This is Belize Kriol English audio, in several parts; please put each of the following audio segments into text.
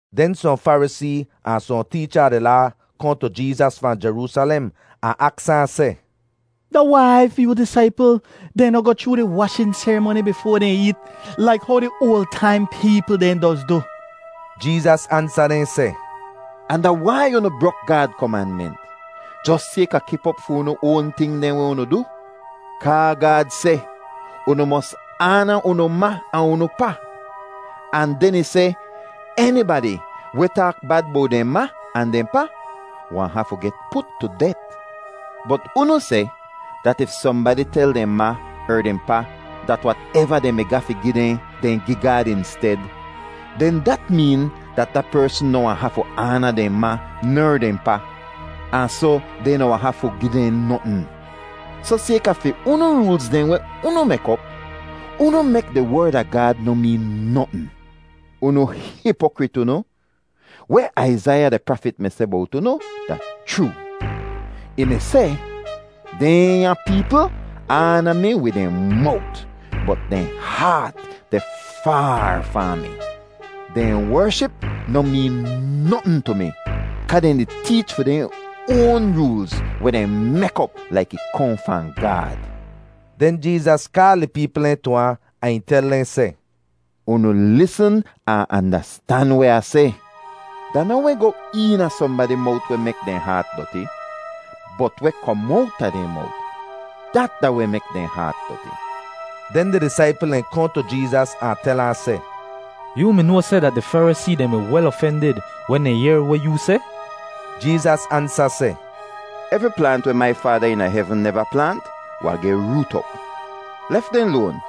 Den sohn Farisee ahn sohn teecha a di Laa kohn tu Jeezas fahn Jeroosalem ahn aks ahn seh, “Da wai fi yoo disaipl dehn noh goh chroo di washin serimoni bifoa dehn eet, laik how di oal taim peepl dehn doz du?” Jeezas ansa dehn seh, “Ahn da wai unu brok Gaad komanment jos sayka kip op fi unu oan ting dehn weh unu du? Kaa Gaad seh, ‘Unu mos aana unu ma ahn unu pa,’ ahn den ih seh, ‘Enibadi weh taak bad bowt dehn ma ahn dehn pa wahn hafu geh put tu det.’ Bot unu seh dat if sohnbadi tel dehn ma er dehn pa dat wateva dehn mi ga fi gi dehn, dehn gi Gaad insted, den dat meen dat da persn noh wahn hafu aana dehn ma ner dehn pa, ahn soh dehn noh wahn hafu gi dehn notn. Soh sayka fi unu roolz dehn weh unu mek op, unu mek di Werd a Gaad noh meen notn. Unu hipokrit unu! Weh Aizaiya di prafit mi seh bowt unu da chroo. Ih mi seh, ‘Dehnya peepl aana mi wid dehn mowt, bot dehn haat deh faar fahn mi. Dehn wership noh meen notn tu mi kaa dehn di teech fi dehn oan roolz, weh dehn mek op laik ih kohn fahn Gaad.’” Den Jeezas kaal di peepl dehn tu ahn, ahn ih tel dehn seh, “Unu lisn ahn andastan weh Ah seh. Da noh weh goh eena sohnbadi mowt weh mek dehn haat doti, bot weh kom owta dehn mowt, dat da weh mek dehn haat doti.” Den di disaipl dehn kohn tu Jeezas ahn tel ahn seh, “Yoo mi noa seh dat di Farisee dehn mi wel ofendid wen dehn yehr weh yoo seh?” Jeezas ansa seh, “Evri plaant weh mai Faada eena hevn neva plaant wahn geh root op. Lef dehn loan;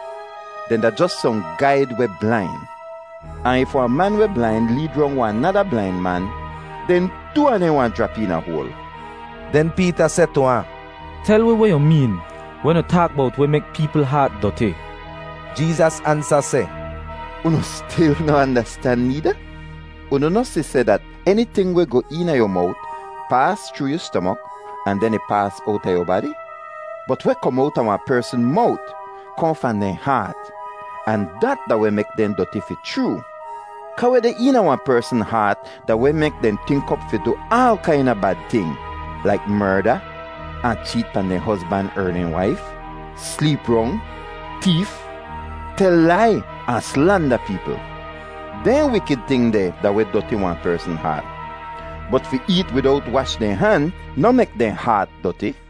dehn da jos sohn gaid weh blain. Ahn if wahn man weh blain leed rong wahn nada blain man, den too a dehn wahn jrap eena hoal.” Den Peeta seh tu ahn, “Tel wi weh yu meen wen yu taak bowt weh mek peepl haat doti.” Jeezas ansa seh, “Unu stil noh andastan needa? Unu noh si seh dat eniting weh goh eena yu mowt paas chroo yu stomok ahn den ih paas owta yu badi? Bot weh kom owta wahn persn mowt kohn fahn dehn haat, ahn dat da weh mek dehn doti fi chroo. Kaa weh deh eena wahn persn haat da weh mek dehn tink op fi du aal kaina bad ting, laik merda, ahn cheet pahn dehn hozban er dehn waif, sleep rong, teef, tel lai ahn slanda peepl. Dehn wikid ting deh da weh doti wahn persn haat. Bot fi eet widowt wash dehn han noh mek dehn haat doti.”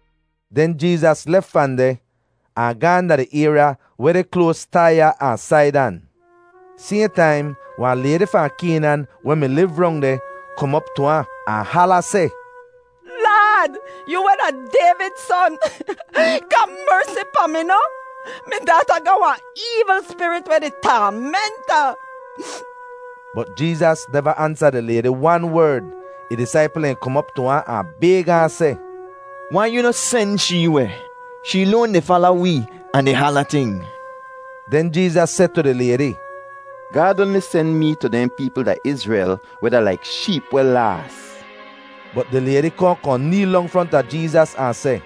Den Jeezas lef fahn deh ahn gaahn da di ayrya weh deh kloas Taiya ahn Saidan. Sayhn taim wahn laydi fahn Kaynan weh mi liv rong deh kom op tu ahn, ahn hala seh, “Laad, yoo weh da Dayvid Son, ga mersi pahn mi noh! Mi daata ga wahn eevl spirit weh di taament ahn.” Bot Jeezas neva ansa di laydi wan werd. Ih disaipl dehn kom op tu ahn, ahn bayg ahn seh, “Wai yu noh sen shee weh? Shee loan di fala wee ahn di hala ting.” Den Jeezas seh tu di laydi, “Gaad oanli sen mee tu dehn peepl da Izrel weh da laik sheep weh laas.” Bot di laydi kohn kohn neel dong fronta Jeezas ahn seh,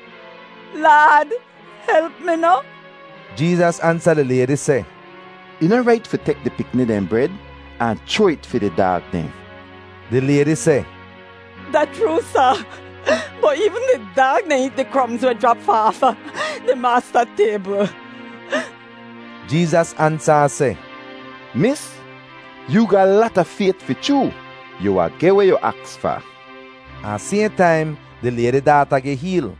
“Laad, help mi noh?” Jeezas ansa di laydi seh, “Ih noh rait fi tek di pikni dehn bred ahn chroa it fi di daag dehn.” Di laydi seh, “Da chroo, Sa, bot eevn di daag dehn eet di kromz weh jrap fahn aafa di maasta taybl.” Jeezas ansa ahn seh, “Mis, yoo ga lata fayt fi chroo! Yu wahn geh weh yu aks fa.” Ahn sayhn taim di laydi daata geh heel.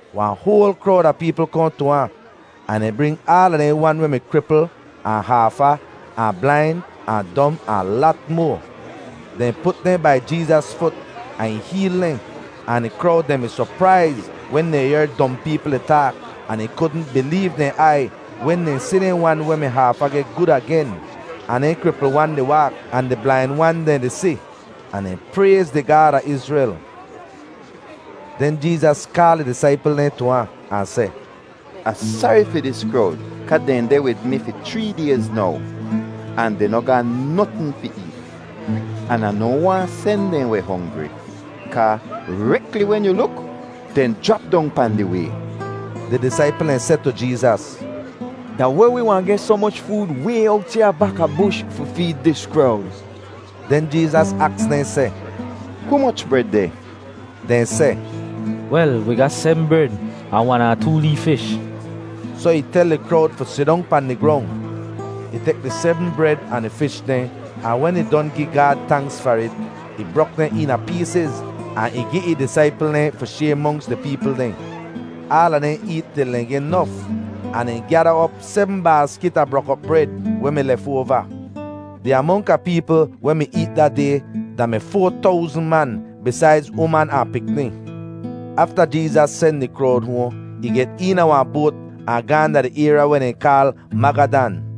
Wahn hoal krowd a peepl kohn tu ahn, ahn dehn bring aala dehn wan weh mi kripl, ahn haafa, ahn blain, ahn dom, ahn lat moa. Dehn put dehn bai Jeezas fut, ahn ih heel dehn; ahn di krowd dehn mi sopraiz wen dehn yehr dom peepl di taak, ahn dehn kudn bileev dehn aiy wen dehn si dehn wan weh mi haafa geh gud agen, ahn dehn kripl wan di waak, ahn di blain wan dehn di si. Ahn dehn prayz di Gaad a Izrel. Den Jeezas kaal ih disaipl dehn tu ahn, ahn seh, “Ah sari fi dis krowd kaa dehn deh wid mi fi chree dayz now, ahn dehn noh ga notn fi eet; an Ah noh waahn sen dehn weh hongri, kaa rekli wen yu luk, dehn jrap dong pahn di way.” Di disaipl dehn seh tu Jeezas, “Da weh wi wahn geh soh moch food way owt ya bakabush fi feed dis krowd?” Den Jeezas aks dehn seh, “Humoch bred deh?” Dehn seh, “Wel, wi ga sebm bred, ahn wan ahn too lee fish.” Soh ih tel di krowd fi sidong pahn di grong. Ih tek di sebm bred ahn di fish dehn, ahn wen ih don gi Gaad tanks far it, ih brok dehn eena peesiz ahn ih gi ih disaipl dehn fi shayr monks di peepl dehn. Aala dehn eet til dehn geh nof, ahn dehn gyada op sebm baaskit a brok-op bred weh mi lefoava. Di amonk a peepl weh mi eet da day da-mi foa towzn man, bisaidz uman ahn pikni. Afta Jeezas sen di krowd hoahn, ih get eena wahn boat ahn gaahn da di ayrya weh dehn kaal Magadan.